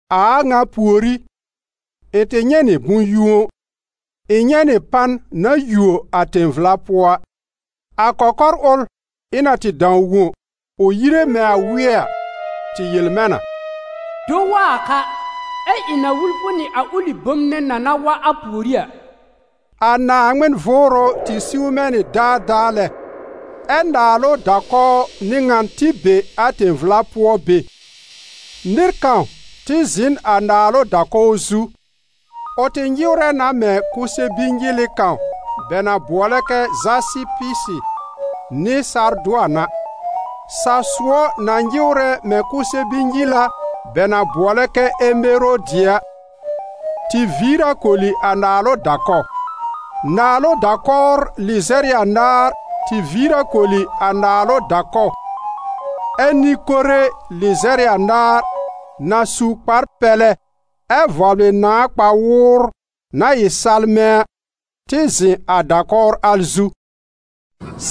A a ŋa pùorí, ɩ̃ tɩ nyɛ̃ nɩ bʋ̃-yũo: ɩ̃ nyɛ̃ nɩ pan na yuo a tẽ-vla pʋɔ a. A kɔkɔr ʋl ɩ̃ na tɩ dãw wõ, ʋ yire mɛ̃ a wɩ́ɛ a, tɩ yel mɛ̃ na: «Do wa a ka, ɛ ɩ̃ na wul fʋ nɩ a ʋlɩ bom nɛ na na wa a pùorí a.» A Naaŋmɩn Vʋʋrʋ tɩ siw mɛ̃ nɩ daadaa lɛ. Ɛ naalʋ da-kɔw n'ɩ ŋan tɩ be a tẽ-vla pʋɔ be. Nɩr kãw tɩ zɩ̃ n a naalʋ da-kɔw zu; ʋ tɩ nyɩwrɛ na mɛ̃ kʋsɛ-bi-nyɩlɩ kãw bɛ na bʋɔlɛ kɛ zasɩpɩ nɩ sardʋan a. Sa-sʋɔ na nyɩwrɛ mɛ̃ kʋsɛ-bi-nyɩla bɛ na bʋɔlɛ kɛ emerodi a, tɩ viir a koli a naalʋ da-kɔw. Naalʋ da-kɔwr lɩzɛr ɩ anaar tɩ viir a koli a naalʋ da-kɔw, ɛ nɩ-kore lɩzɛr ɩ anaar, na su kpar-pɛlɛ ɛ vɔblɩ nãa kpa-wʋʋr na ɩ salmɛ̃ a, tɩ zɩ̃ a da-kɔwr al zu.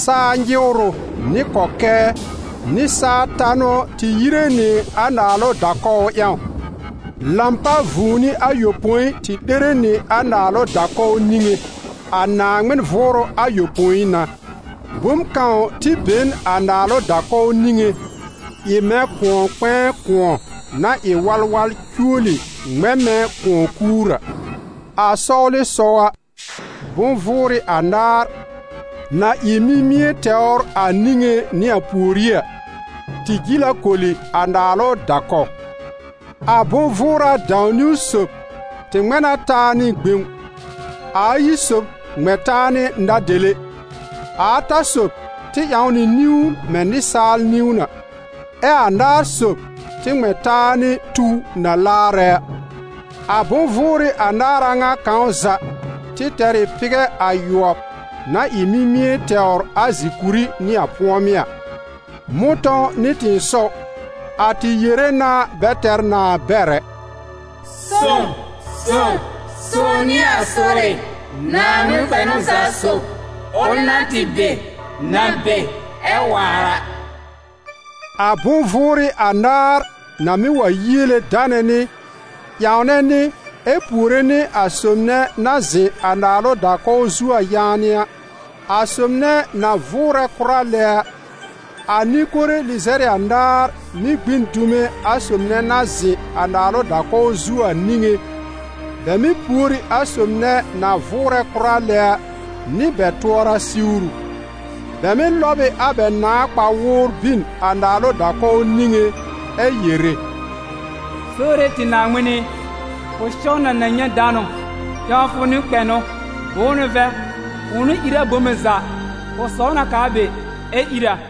Saa nyɩwrʋ, nɩ kɔkɛɛ, nɩ saa tanʋ tɩ yire nɩ a naalʋ da-kɔw ƴãw. Lãpa vũuni ayopõi tɩ 'lere nɩ a naalʋ da-kɔw niŋé: a Naaŋmɩn Vʋʋrʋ ayopõi n'a. Bom kãw tɩ be n a naalʋ da-kɔw niŋé, ɩ mɛ̃ kʋ̃ɔ-kpɛ̃ɛ kʋ̃ɔ na ɩ walwal cuoli ŋmɛ̃ mɛ̃ kʋ̃ɔ-kuur A sɔwlɩsɔw a, bʋ̃-vʋʋrɩ anaar, na ɩ mimie tɛwr a niŋé nɩ a pùorí a, tɩ jil a koli a naalʋ da-kɔw. A bʋ̃-vʋʋra dãw-niwn sob tɩ ŋmɛ̃ na taa nɩ gbẽw, a ayi sob ŋmɛ̃ taa nɩ na-dele; a ata sob tɩ ƴãw nɩ niwn mɛ̃ nɩsaal niwn a; ɛ a anaar sob tɩ ŋmɛ̃ taa nɩ tuw na laarɛ a. A bʋ̃-vʋʋrɩ anaar a ŋa kãw za tɩ tɛr ɩ pɩgɛ ayʋɔb na ɩ mimie tɛwr a zi-kuri nɩ a pʋ̃ɔmɩ́ a. Mʋ̃tɔ̃w nɩ tɩ̃ɩsɔw, a tɩ yere na bɛ tɛr nãa bɛr ɛ: «Sõw, sõw, sõw n'ɩ a Sore, Naaŋmɩn kpɛnʋ za sob, ʋl na tɩ be, na be, ɛ waar a!» A bʋ̃-vʋʋrɩ anaar na mɩ́ wa yiele danɛ nɩ, ƴãwnɛ nɩ ɛ puore nɩ a sob nɛ na zɩ̃ a naalʋ da-kɔw zu a yaanɩ a, a sob nɛ na vʋʋrɛ kʋra lɛ a, a nɩ-kore lɩzɛr ɩ anaar mɩ́ gbĩ n dume a sob nɛ na zɩ̃ a naalʋ da-kɔw zu a niŋé, bɛ mɩ́ pùor ɩ a sob nɛ na vʋʋrɛ kʋra lɛ a, nɩ bɛ tʋɔra siwru. Bɛ mɩ́ lɔb ɩ a bɛ nãà kpa-wʋʋr bin a naalʋ da-kɔw niŋé ɛ yere: «Sore tɩ Naaŋmɩn ɩ, fʋ sɛw na na nyɛ̃ danʋ, ƴãwfʋ nɩ kpɛnʋ. Bʋ̃ʋ n'ʋ vɛ̃, fʋ̃ʋ n'ʋ ír a bome za, fʋ saw na k'aa be, ɛ́ ír a.»